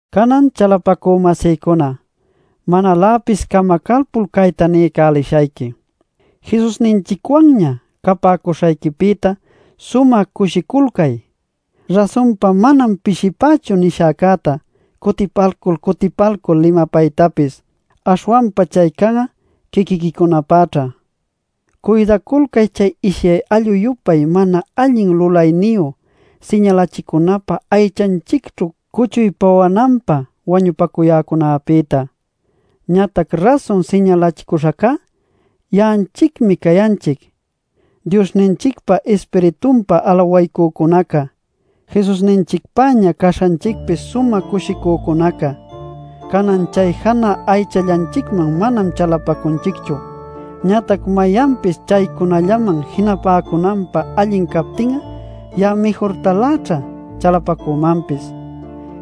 Canan chalapacü-masïcuna, manaläpis camacalpul cayta niycälishayqui: Jesusninchicwanña capäcuśhayquipïta sumä cushiculcay. Rasunpa manam pishipächu nishäcäta cutipalcul cutipalcul limapaytapis; aśhwanpa chay can'a quiquiquicunapäćha. Cuydaculcay chay ishyay allu-yupay mana allin lulayniyu siñalachicunapä aychanchicćhu cuchuy pawananpä wañupacuyäcunäpïta. Ñatac rasun siñalacuśhancá ya'anchicmi cayanchic, Diosninchicpa Ispiritunpa alawaycücunaca, Jesusninchicpäña caśhanchicpi sumä cushicücunaca. Canan chay janä aychallanchicman manam chalapacunchicchu. Ñatac mayanpis chaycunallaman jinapäcunanpä allin captin'a ya'a mïjurtaläćha chalapacümanpis.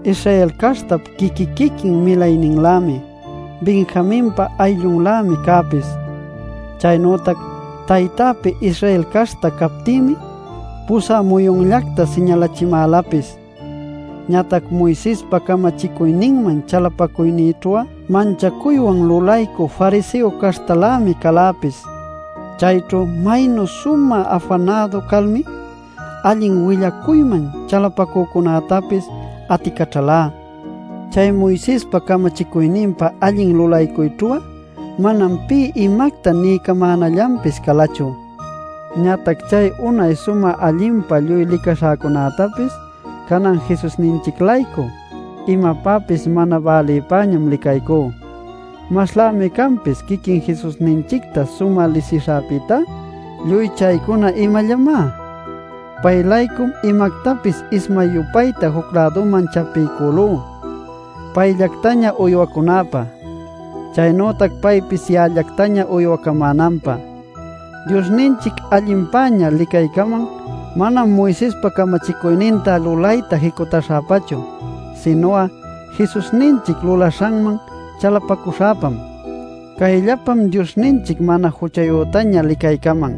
Israel caśhtap quiqui-quiquin milayninlämi, Benjaminpa ayllunmi cäpis. Chaynütac taytäpi Israel caśhta captïmi, pusä muyunllacta siñalächimälapis. Ñatac Moisespa camachicuyninman chalapacuynïćhu'a manchacuywan lulaycü fariseo caśhtalämi caläpis. Chayćhu maynu sumä afanädu calmi, allin willacuyman chalapacücunätapis aticaćhalá. Chay Moisespa camachicuyninpa allin lulaycuyćhu'a manam pï imacta niycamänallanpis calachu. Ñatac chay unay sumä allinpa lluy licaśhäcunätapis, canan'a Jesusninchic-laycu imapäpis mana bälipäñam licaycú. Maslämi canpis quiquin Jesusninchicta sumä lisishäpïtá ¿lluy chaycuna imallamá? Pay-laycum imactapis ismay-yupayta juc-läduman chapiycülú payllactaña uywacunäpä, chaynütac paypis ya'allactaña uywacamänanpä. Diosninchic allinpäña licaycaman, manam Moisespa camachicuyninta lulayta jicutaśhäpachu, sinu'a Jesusninchic lulaśhanman chalapacuśhäpam. Cayllapam Diosninchic mana juchayütaña licaycaman.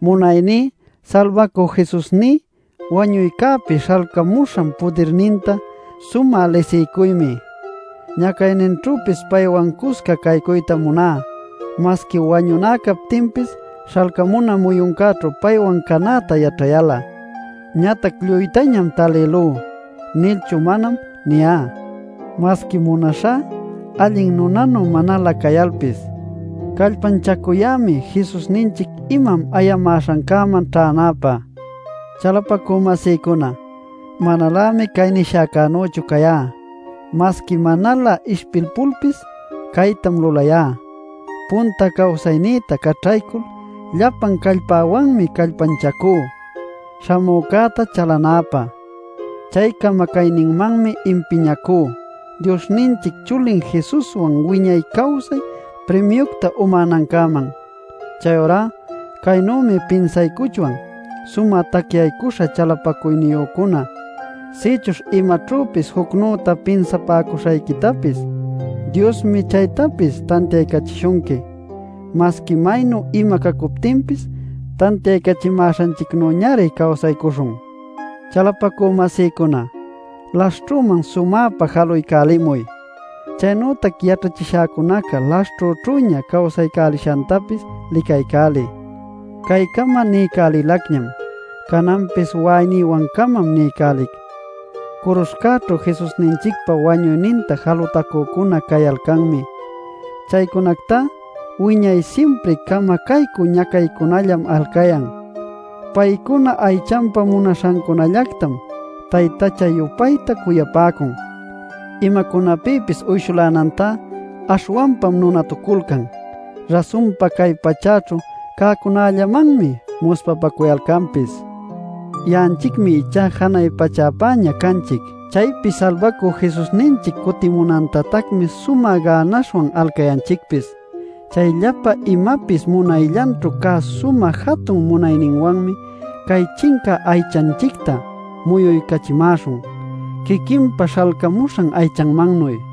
Munayní Salbacü Jesusní wañuycäpi śhalcamuśhan pudirninta sumä lisiycuymi. Ñacayninćhüpis paywan cusca caycuytam muná masqui wañuná captinpis śhalcamuna muyuncäćhu paywan canäta yaćhayal'a. Ñatac “lluytañam talïlú” nilchu manam niyá. Masqui munaśhá allin nunanu manalä cayalpis, callpanchacuyämi Jesusninchic imam ayamäśhancäman ćhänäpä. Chalapacü-masïcuna, manalämi cay nishäcänüchu cayá. Masqui manalä ishpilpulpis caytam lulayá: punta cawsaynïta caćhaycul llapan callpäwanmi callpanchacú śhamücäta chalanäpä. Chay camacayninmanmi impiñacú Diosninchic chulin Jesuswan wiñay cawsay primiucta umänancäman. Chayurá caynümi pinsaycuchwan sumä tacyaycuśha chalapacuyniyücuna. Sïchuśh imaćhüpis jucnüta pinsapäcuśhayquitapis, Diosmi chaytapis tantiaycachishunqui. Masqui maynu ima cacuptinpis tantiaycachimäśhanchicnüñari cawsaycuśhun. Chalapacü-masïcuna, laśhćhüman sumäpa jaluycälimuy; chaynütac yaćhachishäcunaca laśhćhüćhüña cawsaycälishantapis licaycäliy. Caycama niycälilacñam, cananpis wa'aynïwan-camam niycälic: curuśhcäćhu Jesusninchicpa wañuyninta jalutacücuna cayalcanmi. Chaycunactá wiñay simpri camacaycü ñacaycällam alcayan. Paycuna aychanpa munaśhancunallactam taytacha-yupayta cuyapäcun. Imacunapïpis uyshulänantá aśhwanpam nunatuculcan. Rasunpa cay pachäćhu cäcunällamanmi muspapacuyalcanpis. Ya'anchicmi ichá janay pachäpäña canchic. Chaypi Salbacü Jesusninchic cutimunantatacmi sumä gänaśhwan alcayanchicpis. Chay llapa imapis munayllanćhu cá sumä jatun munayninwanmi cay chincä aychanchicta muyuycachimäśhun quiquinpa śhalcämuśhan aychanmannuy.